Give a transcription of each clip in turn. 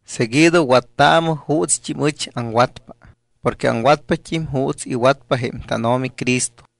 Seguido wattaamɨ juutst́im ɨch aŋwatpa porque aŋwatpat́im juuts iwatpa jém tánO̱mi Cristo.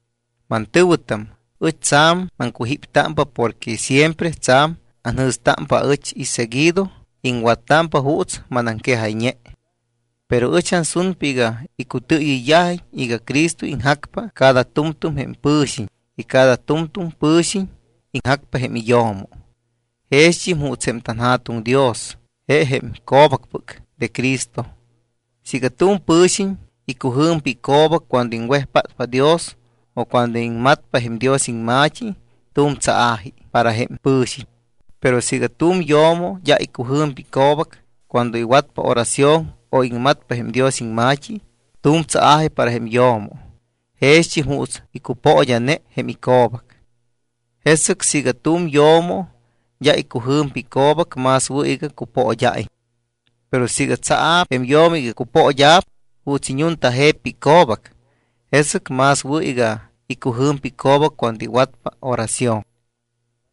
Mantɨ̱wɨtam, ɨch tsa̱m maŋcujíptámpa porque siempre tsa̱m anjɨ̱stámpa aɨch y seguido iŋwattámpa juuts manaŋquejayñe. Pero ɨch ansunpa iga iŋcutɨɨyɨyt́ámiñ iga Cristo iŋjacpa cada tu̱mtu̱m jém pɨ̱xiñ. Y cada tu̱mtu̱m pɨ̱xiñ iŋjacpa jém iyo̱mo. Jext́im juuts jém tanJa̱tuŋ Dios je jém co̱bacpɨc de Cristo. Siiga tu̱m pɨ̱xiñ icujɨ̱mpa ico̱bac cuando iŋwejpátpa Dios o cuando iŋmatpa jém Dios iŋma̱t́i, tu̱m tsaa̱ji para jém pɨ̱xiñ. Pero siiga tu̱m yo̱mo d́a icujɨ̱mpa ico̱bac cuando iwatpa oración o iŋmatpa jém Dios iŋma̱t́i, tu̱m tsaa̱ji para jém yo̱mo jext́im juuts icupood́a̱ne jém ico̱bac. Jesɨc siiga tu̱m yo̱mo d́a icujɨ̱mpa ico̱bac, más wɨ̱ iga cupood́a̱iñ. Pero siiga tsaa̱p jém yo̱mo iga cupood́a̱p juuts iñuntajeppa ico̱bac, jesɨc más wɨ̱ iga icujɨ̱mpa ico̱bac cuando iwatpa oración.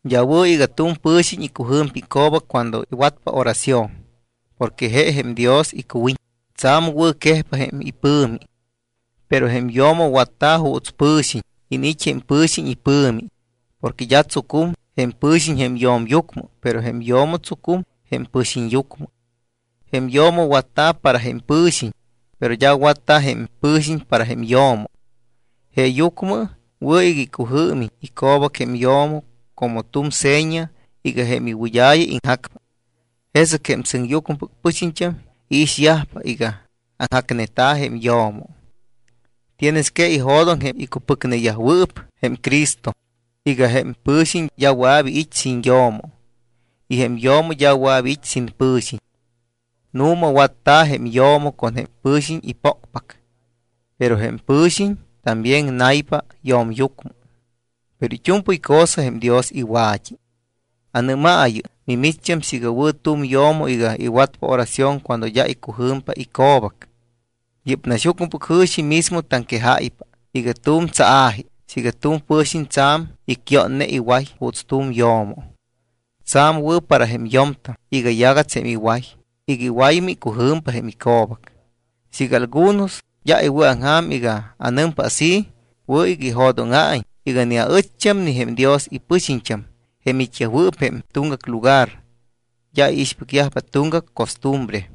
D́a wɨ̱ iga tu̱m pɨ̱xiñ icujɨ̱mpa ico̱bac cuando iwatpa oración porque je jém Dios icuwiñ, tsa̱m wɨ̱quejpa jém ipɨ̱mi. Pero jém yo̱mo watta̱ juuts pɨ̱xiñ, iniit́ jém pɨ̱xiñ ipɨ̱mi. Porque d́a tsucum jém pɨ̱xiñ jém yo̱myucmɨ, pero jém yo̱mo tsucum jém pɨ̱xiñyucmɨ. Jém yo̱mo watta̱ para jém pɨ̱xiñ. Pero d́a watta̱ jém pɨ̱xiñ para jém yo̱mo. Jeeyucmɨ wɨ̱ iga icujɨɨmiñ ico̱bac jém yo̱mo como tu̱m seña iga jém iwɨd́a̱ya iŋjacpa, jesɨc jém sɨŋyucmɨpɨc pɨxiñt́am iixyajpa iga aŋjacneta̱ jém yo̱mo. Tienes que ijo̱doŋ jém icupɨcneyajwɨɨp jém Cristo iga jém pɨ̱xiñ d́a wɨa̱p iit́ sin yo̱mo y jém yo̱mo d́a wɨa̱p iit́ sin pɨ̱xiñ. Nu̱ma watta̱ jém yo̱mo con jém pɨ̱xiñ ipócpac. Pero jém pɨ̱xiñ también naypa yo̱myucmɨ. Pero it́u̱mpɨy cosa jém Dios iwa̱t́i. ¿Anɨ́maayɨ mimicht́am siiga wɨ̱ tu̱m yo̱mo iga iwatpa oración cuando d́a icujɨ̱mpa ico̱bac? Yɨ́p naxyucmɨpɨc jɨ̱xi mismo taŋquejáypa iga tu̱m tsaa̱ji siiga tu̱m pɨ̱xiñ tsa̱m icyoone iway juuts tu̱m yo̱mo. Tsa̱m wɨ̱ para jém yo̱mtam iga yagats jém iway iga iwaymɨ icujɨ̱mpa jém ico̱bac. Siiga algunos d́a iwɨ̱aŋja̱m iga anɨmpa así, wɨ̱ iga ijo̱dóŋa̱iñ iga ni aɨcht́am ni jém Dios ipɨxiñt́am, jém it́yajwɨɨp jém tuŋgac lugar, d́a iixpɨcyajpa tuŋgac costumbre.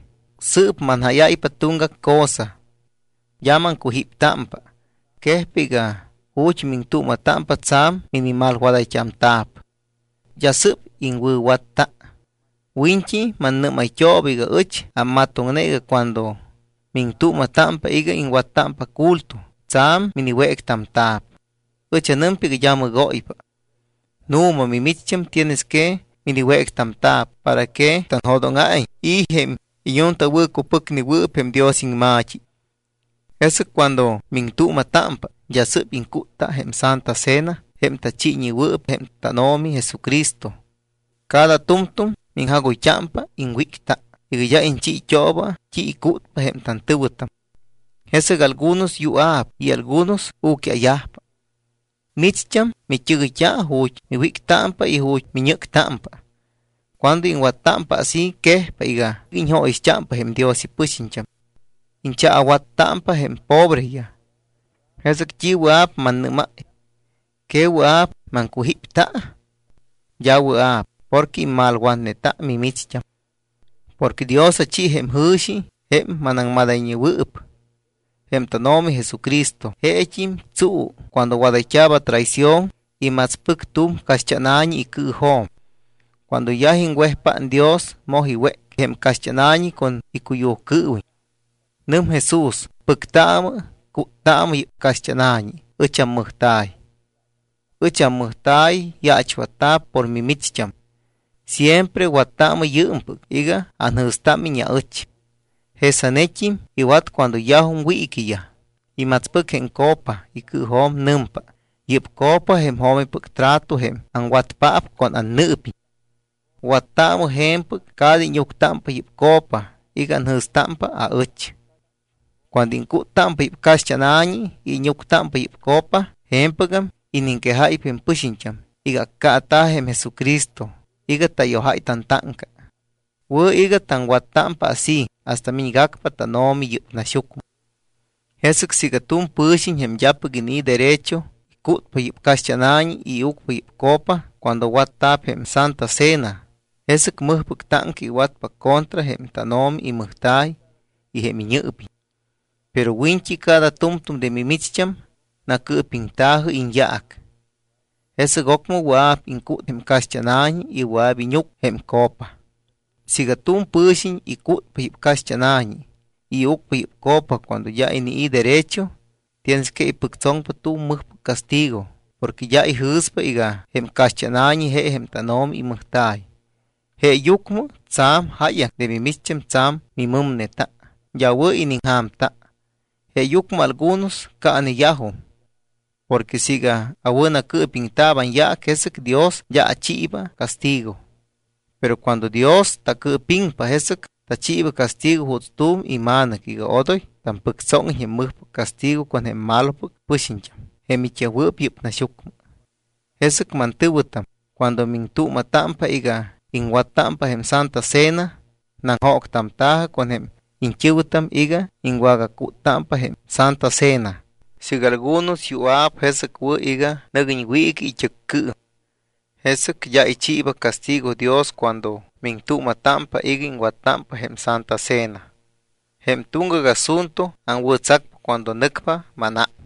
Sɨɨp manjáyáypa tuŋgac cosa. D́a maŋcujíptámpa. Quejpa iga ju̱t́ miŋtuuma̱támpa tsa̱m minimalwadayt́amta̱p, d́a sɨ́p iŋwɨ̱watta. Wiñt́i mannɨ́mayt́ooba iga ɨch ammatoŋne iga cuando miŋtuuma̱támpa iga iŋwattámpa culto tsa̱m miniwéctamta̱p. Ɨch anɨmpa iga d́a mɨgóypa. Nu̱ma, mimicht́am tienes que miniwéctamta̱p para que tanjo̱dóŋa̱iñ i̱ jém iñuntawɨ̱cupɨcnewɨɨp jém Dios iŋma̱t́i. Jesɨc cuando miŋtuuma̱támpa, d́a sɨ́p iŋcútta jém Santa Cena jém tachiiñewɨɨp jém tánO̱mi Jesucristo. Cada tu̱mtu̱m miŋjagoyt́ámpa iŋwícta iga d́a iñchiit́ooba t́i icútpa jém tantɨ̱wɨtam. Jesɨc algunos yua̱p y algunos u̱quia̱yajpa. Micht́am mit́ɨgɨyt́a ju̱t́ miwíctámpa y ju̱t́ miñɨ́ctámpa. Cuando iŋwattámpa así quejpa iga iñjóyixt́ámpa jém Dios ipɨxiñt́am. Iñchaawattámpa jém pobreyaj. ¿Jesɨc t́i wɨa̱p mannɨ́máy? ¿Que wɨa̱p maŋcujípta? D́a awɨa̱p porque immalwatneta mimicht́am. Porque Dios achi jém jɨ̱xi jém manaŋmadayñewɨɨp. Jém tánO̱mi Jesucristo jeet́im tsuu cuando wadayt́a̱p atraición, imatspɨc tu̱m caxt́ána̱ñi icɨɨjo̱m, cuando yaj iŋwejpát Dios, moj iwéc jém caxt́ána̱ñi con icuyujcɨɨwiñ. Nɨm Jesús: “Pɨctaamɨ, cúttaamɨ. Yɨ́p caxt́ána̱ñi ɨch ammɨjta̱y. Ɨch ammɨjta̱y yaachwatta̱p por mimicht́am. Siempre wattaamɨ yɨɨmpɨc iga anjɨ̱stámiñ aɨch.” Jesanet́im iwat cuando yajum wiiquiyaj, imatspɨc jém copa icɨɨjo̱m. Nɨmpa: “Yɨ́p copa jém jo̱mipɨc trato jém aŋwatpaap con annɨɨpiñ. Wattaamɨ je̱mpɨc cada íñuctámpa yɨ́p copa iga anjɨ̱stámpa aɨch.” Cuando iŋcúttámpa yɨ́p caxt́ána̱ñi y íñuctámpa yɨ́p copa, je̱mpɨgam iniŋquejáypa jém pɨxiñt́am iga accaata̱ jém Jesucristo iga tayojáy tantáŋca. Wɨ̱ iga taŋwattámpa así hasta miñgacpa tánO̱mi yɨ́p naxyucmɨ. Jesɨc siiga tu̱m pɨ̱xiñ, jém d́apɨc inii̱ derecho, icútpa yɨ́p caxt́ána̱ñi y iucpa yɨ́p copa cuando watta̱p jém Santa Cena, jesɨc mɨjpɨc táŋca iwatpa contra jém tánO̱mi imɨjta̱y y jém iñɨɨpiñ. Pero wiñt́i cada tu̱mtu̱m de mimicht́am nacɨɨpiŋta̱jɨ iñyaac, jesɨc ocmɨ wɨa̱p iŋcút jém caxt́ána̱ñi y wɨa̱p íñuc jém copa. Siiga tu̱m pɨ̱xiñ icútpa yɨ́p caxt́ána̱ñi y iucpa yɨ́p copa cuando d́a inii̱ derecho, tienes que ipɨctsoŋpa tu̱m mɨjpɨc castigo porque d́a ijɨ̱spa iga jém caxt́ána̱ñi je jém tánO̱mi imɨjta̱y. Jeeyucmɨ tsa̱m jáyaŋ de mimicht́am tsa̱m mimɨmneta, d́a wɨ̱ iniŋja̱mta. Jeeyucmɨ algunos caaneyajum. Porque siiga awɨ̱nacɨɨpiŋta̱p anyaac, jesɨc Dios d́a achiiba castigo. Pero cuando Dios tacɨɨpiŋpa, jesɨc tachiiba castigo juuts tu̱m ima̱nɨc iga odoy tampɨctsóŋiñ jém mɨjpɨc castigo con jém malopɨc pɨxiñt́am jém it́yajwɨɨp yɨ́p naxyucmɨ. Jesɨc, mantɨ̱wɨtam, cuando miŋtuuma̱támpa iga iŋwattámpa jém Santa Cena, naŋjóctamta̱jɨ con jém iñt́ɨ̱wɨtam iga iŋwagacúttámpa jém Santa Cena. Siiga algunos yua̱p, jesɨc wɨ̱ iga nɨguiñ wiiqui it́ɨccɨɨm. Jesɨc d́a ichiiba castigo Dios cuando miŋtuuma̱támpa iga iŋwattámpa jém Santa Cena. Jém tuŋgac asunto aŋwɨ̱tsacpa cuando nɨcpa mánám.